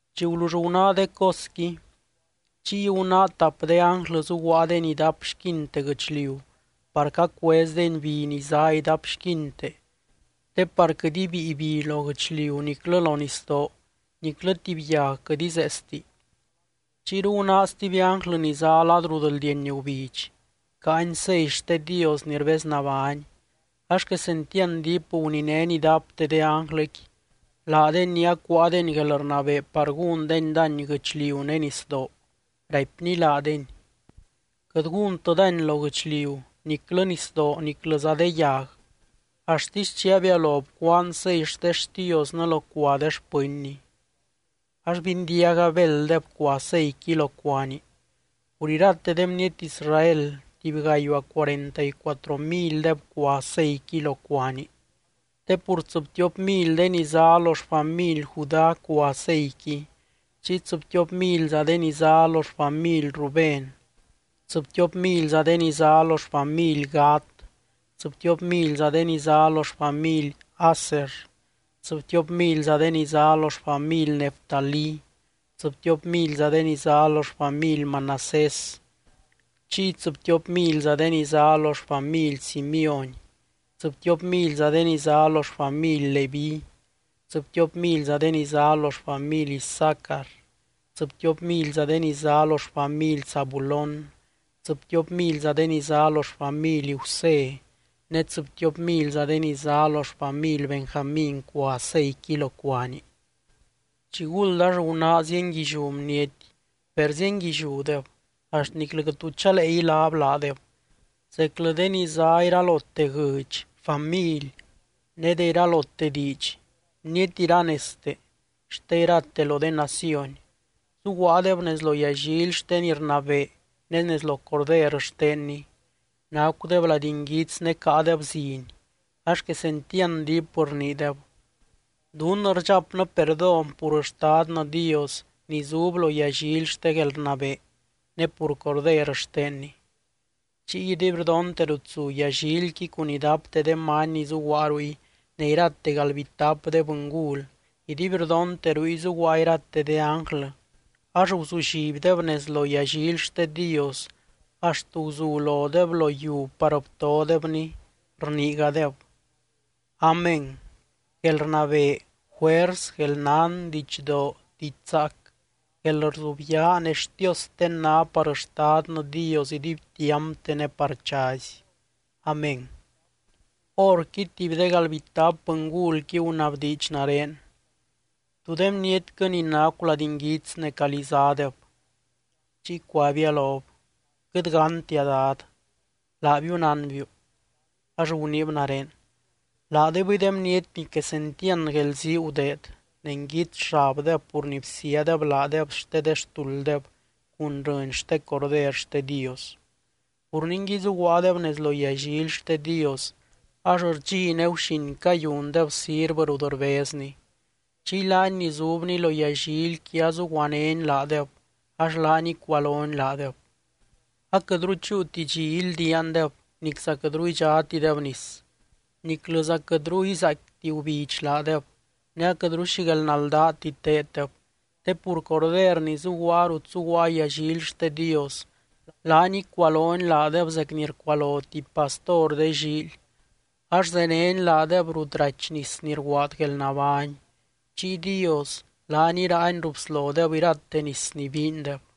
Chi gulull gunáa de cosqui, chiy gunáa tap de ánglɨ zuguaadeny idap xquinte guɨchliu par cacuezdeny bi ni zá idap xquinte, te par quɨt ibíi bi lo guɨchliu, niclɨ lo nisdoo, niclɨ tuby yag quɨt izeesti. Chiyru gunáa stuby ánglɨ ni zá lad rut rldieny gubidx, caany sei xte Dios ni rbeznabány. Ax quesentiand diip guninény idapte de ánglɨqui, laadeny ni acuáadeny guelrnabee par gúndeny dány guɨchliu ne nisdoo, raipny laadeny: —Quɨt gúntɨ dány lo guɨchliu, niclɨ nisdoo, niclɨza de yag, axtisy chi abialo bcuaan sei xte Xtiosnɨ locua de xpɨnny. Ax bindiaga bélddeb cua seiqui locuani. Pur irate de bniety Israel, tuby gayuaa cuarenta y cuatro milydeb cua seiqui locuani. Te pur tsɨbtiop mily de ni zá lo xfamily Judá cua seiqui, chiy tsɨbtiop milyza de ni zá lo xfamily Rubén, tsɨbtiop milyza de ni zá lo xfamily Gad, tsɨbtiop milyza de ni zá lo xfamily Aser, tsɨbtiop milyza de ni zá lo xfamily Neftalí, tsɨbtiop milyza de ni zá lo xfamily Manasés, chiy tsɨbtiop milyza de ni zá lo xfamily Simeóny, tsɨbtiop milyza de ni zá lo xfamily Leví, tsɨbtiop milyza de ni zá lo xfamily Isacar, tsɨbtiop milyza de ni zá lo xfamily Zabulón, tsɨbtiop milyza de ni zá lo xfamily Gusé, ne tsɨbtiop milyza de ni zá lo xfamily Benjamín cua seiqui locuani. Chiguld ax gunáa zienguilliú bniety, per zienguilliúdeb axt niclɨ quɨt tu chalee ilab laadeb, zeclɨ de ni zá iralote guɨdx, family, ne de iralote diidx, bniety iranezte, xte irate lo de naciony. Zuguaadeb nez lo yallily xte ni rnabee ne nez lo Corder xtenny. Nacudeb lady nguits ne caadeb ziny, ax quesentiand diip rniideb: Dunnɨ rdxapnɨ perdón pur Xtadnɨ Dios ni zub lo yallily xte guelrnabee ne pur Corder xtenny. Chiy iduibrdonte rut zu yallilqui cun idapte de many ni zuguaa ruy ne irate galdbitap de bɨngul, iduibrdonte ruy zuguaa irate de ánglɨ ax guzullibdeb nez lo yallily xte Dios axt guzu lodeb lo yiu par btodebny, rniigadeb: ¡Amén! Guelrnabee, juers, guelnán, didxdoo, diidx zaac, guelrzubyaa ne xtiosten ná par Xtadnɨ Dios iduibtiampte ne par chazy. Amén. Horqui tuby de galdbitap bɨngulqui gunabdiidx nare: —¿Tú de bnietquɨ ni nacu lady nguits, ne calí zádeb? Chiy cuabia lob: —Quɨt gántia, dad. Laabiu nánbiu. Ax guniib nare: —Laadebɨy de bniety ni quesentiand guelzii gudeed, ne nguits xabdeb pur ni bsíadeb laadeb xte de xtulddeb cun rɨny xte Corder xte Dios. Pur ningui, zuguaadeb nez lo yallily xte Dios, ax rdxi ne guxin cayundeb sirvɨ rut rbezny. Chiy laany ni zubny lo yallilqui azuguanény laadeb, ax laany icualony laadeb. Aquɨtru chúuti dxi ildiaandeb, nicza quɨtru idxátideb nis, niclɨza quɨtru izaaicquiti gubidx laadeb, ne aquɨtru xi guelnaldaati teeddeb. Te pur Corder ni zuguaa rut zuguaa yallily xte Dios, laany icualony laadeb zec ni rcualo tuby pastor de llíily, ax zenény laadeb rut rachy nis ni rguaad guelnabány. Chiy Dios, laany iraany ruu bslodeb irate nis ni biindeb.